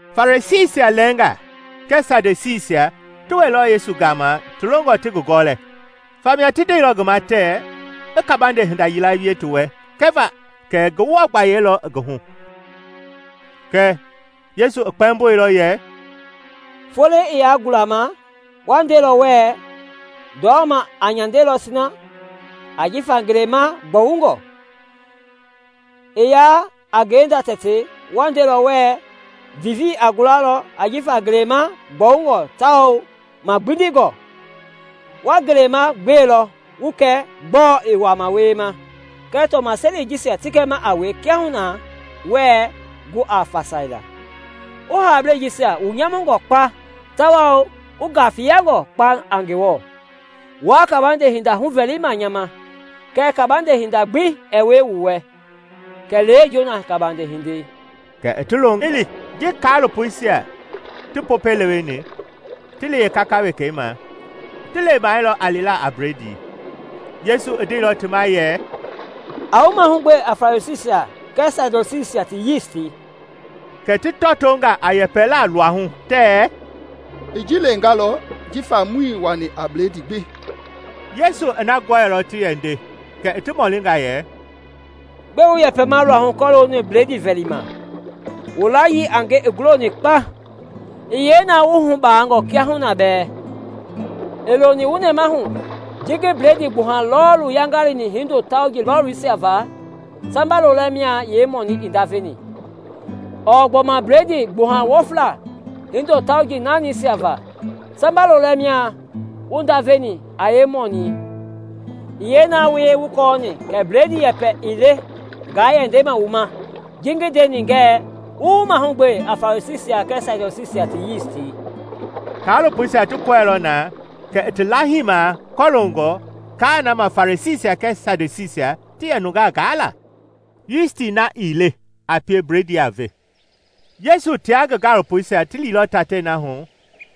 Farisiisia lɛɛnga kɛɛ Sadusiisia ti wɛilɔ Yesu gama ti longɔ ti ngi gɔlɛ, famia ti ndeilɔ ngi ma tɛɛ i kabande hinda yila wie ti wɛ kɛva kɛ Ngewɔ gbayei lɔ ngi hu. Kɛɛ Yesu i kpɛmboilɔ yɛ, “Foloi i yaa gulama, wa ndelɔ wɛɛ, ‘Ndɔma a nyandelɔ sina, ajifa ngelei ma gbɔwungɔ.’ I yaa a ngenda tɛtei wa ndelɔ wɛɛ, ‘Vivii i gulamaa ajifa ngelei ma gbɔwungɔ tawao magbindingɔ.’ Wa ngeleima gbelɔ wu kɛ gbɔɔ i wama wiema kɛɛ tɔmaseli jisia ti gɛma kiahuna wɛɛ gu a fasaila! Wu haablei jisia wu nyamuni kpa tawao wu gafiyani kpa a Ngewɔ! Wuaa kabande hinda huvɛlima nya ma, kɛɛ kabande hinda gbi ɛɛ wie wu wɛ kɛlee Jona gabande hindei.” Kɛ i ti longa i li. Ji kaalopoisia ti Popɛi leweni, ti li yeekaka wekei ma, ti lemailɔ a lila a bledii. Yesu i ndeilɔ ti ma yɛ, “A wu mahugbe a Farisiisia kɛɛ Sadusiisia ti yisti.” Kɛ ti tɔtonga a yɛpɛlaa luahu tɛɛ, “I ji lengalɔ jifa muii wani a bledii gbi.” Yesu i na gɔɛilɔ ti yɛ nde kɛ i ti mɔlinga yɛ, “Gbɛe wu yɛpɛma luahu kɔlooni bledii vɛli ma? Wu layii a nge i guloni kpa! I yee na wu wuhu baangɔ hii kiahuna bɛɛ? Ii loni wu nɛmahu ji ngi bledii gbuha lɔɔlii yaingaini hindo tauji lɔlisia va samba lolɛ mia yeemɔnii i ndaveni? Ɔɔ gbɔma bledii gbuha wɔflei hindo tauji naanisia va, samba lolɛ mia wu ndaveni a yeemɔnii? I yee na wuii kɔɔni kɛ bledii yɛpɛ ii le nga yɛ ndema wu ma ji ngi ndeni ngɛɛ wu wu mahugbe a Farisiisia kɛɛ Sadusiisia ti yisti!” Kaalopoisia ti kɔɛilɔ na kɛ i ti laahima kɔlongɔ kaa na lɔ ma Farisiisia kɛɛ Sadusiisia ti yɛ nungaa gaa la, yisti na ii le a pie bledii a ve. Yesu tia ngi gaalopoisia ti liilɔ tatei na hu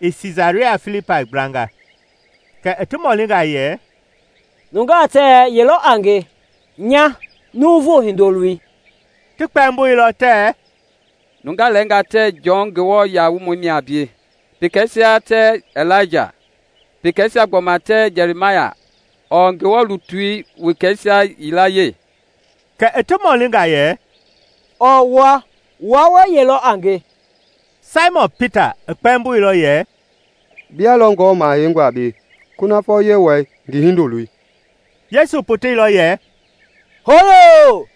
i Siisaria Filipai gblanga kɛ i ti mɔlinga yɛ, “Nungaa tɛɛ ye lɔ a nya nya Nuuvu Hindoloi?” Ti kpɛmboilɔ tɛɛ, “Nungaa lɛɛnga tɛɛ Jɔn Nguamɔi mia a bie, pekeisia tɛɛ Ilaija, pekeisia gbɔma tɛɛ Jɛrimaya ɔɔ Ngewɔ lutui wekeisia yilayee.” Kɛ i ti mɔlinga yɛ, “Ɔɔ wua? Wua wɛɛ ye lɔ a nge?” Saimɔn Pita i kpɛmboilɔ yɛ, “Bia lɔ Ngewɔ Maha Heingɔi a bie, kunafɔ Yewɔɛi ngi Hindoloi.” Yesu poteilɔ yɛ, “Hooyoo,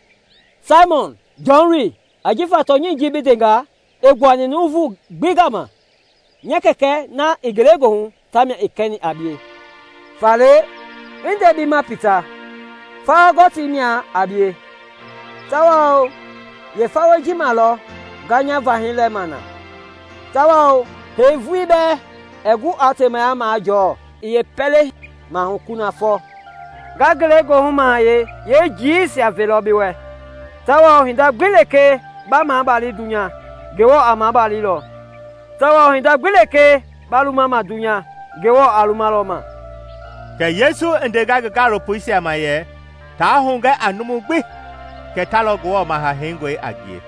Saimɔn, Jɔn loi! Ajifa tɔnyɛi ji bi ndenga ii gbuani nuuvu gbi gama; nya Kɛkɛ na i ngelegoohu ta mia i kɛni a bie. Faale, ngi nde bi ma, Pita, fawa gɔtii mia a bie, tawao yeefawei ji ma lɔ nga nya Vahɛi lɛma na tawao hee vulii bɛɛ ɛɛ gu aa temaya jɔɔ yeepɛlei maahu kunafɔ. Nga Ngelegoohu Mahayɛi yeejiiwiisia velɔ bi wɛ, tawao hinda gbi lekee ba mabali dunya, Ngewɔ a maabalilɔ, tawao hinda gbi lekee ba luma ma dunya, Ngewɔ a lumalɔ ma.” Kɛ Yesu i ndenga ngi gaalopoisia ma yɛ taa hugɛ a numu gbi kɛ ta lɔ Ngewɔ Maha Heingɔi a ngie.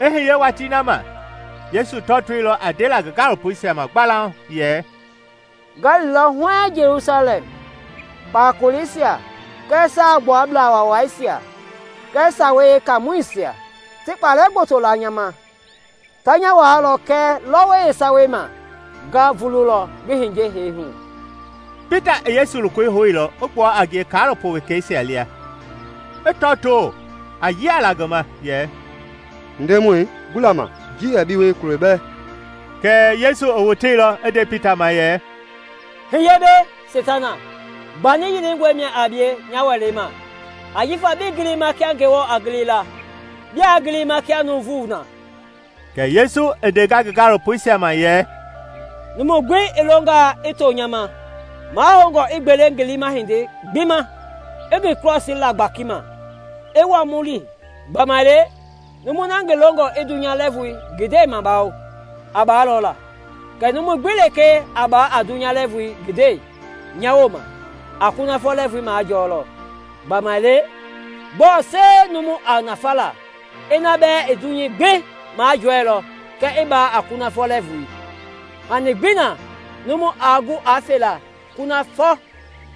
I hiye watii na ma, Yesu tɔtoilɔ a ndela ngi gaalopoisia ma gbalauŋ yɛ, “Nga lilɔ huɛɛŋ Jelusalɛm, kpakoleisia kɛɛ Saagbuablaa Waawaisia kɛɛ Sawei Yeekaamɔisia ti kpalɛ gboto la nya ma. Ta nya waalɔ kɛɛ lɔwɔi yeesawei ma nga vululɔ ngi hiye hee hu.” Pita i Yesu lokoi houilɔ i gbua a ngie kaalopo wekeisia lia, i tɔtoo a yialaa ngi ma yɛ, “Ndemɔi, gbula ma! Ji ɛɛ bi wie kulo bɛɛ!” Kɛɛ Yesu i woteilɔ i nde Pita ma yɛ, “Hiye mbɛ, Seitana! Gbani yilingɔ mia a bie nya welei ma, ajifa bii gilima kia Ngewɔ a gili la, biaa gilima kia nuuvu na.” Kɛ Yesu i ndenga ngi gaalopoisia ma yɛ, “Numu gbi i longalɔ i to nya ma, mahoungɔ i gbele ngi liima hindei gbi ma, i ngi krɔsii la gbakima, i wa mu li. Gbamaile numui na ngi longɔ i dunya lɛɛvui ngi ndɛi mabawao, a baalɔ la; kɛɛ numu gbi lekee a baa a dunya lɛɛvui ngi ndɛi nya wooma, a kunafɔ lɛɛvui majɔɔlɔ. Gbamaile gbɔɔ sie a numu nafa la ina bɛɛ i dunyei gbi majɔɛilɔ kɛɛ i baa a kunafɔ lɛɛvui? Hani gbii na numu aa gu a felaa kunafɔ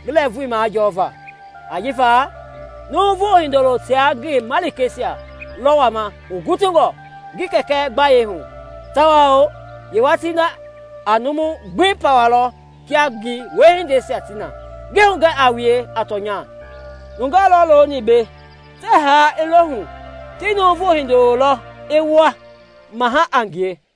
lɛɛvui majɔva. Ajifa Nuuvu Hindoloi tia ngi malikeisia lɔ wama hugutungɔ ngi Kɛkɛ gbayei hu, tawao yeewatii na, a numui gbi pawalɔ kia ngi wiehindeisia ti na. Ngi hugɛ a wue a tɔnya, nungaa lɔ looni mbei tɛɛ haa i lo hu ti Nuuvu H indoloi lɔ i wa Mahɛi a ngie.”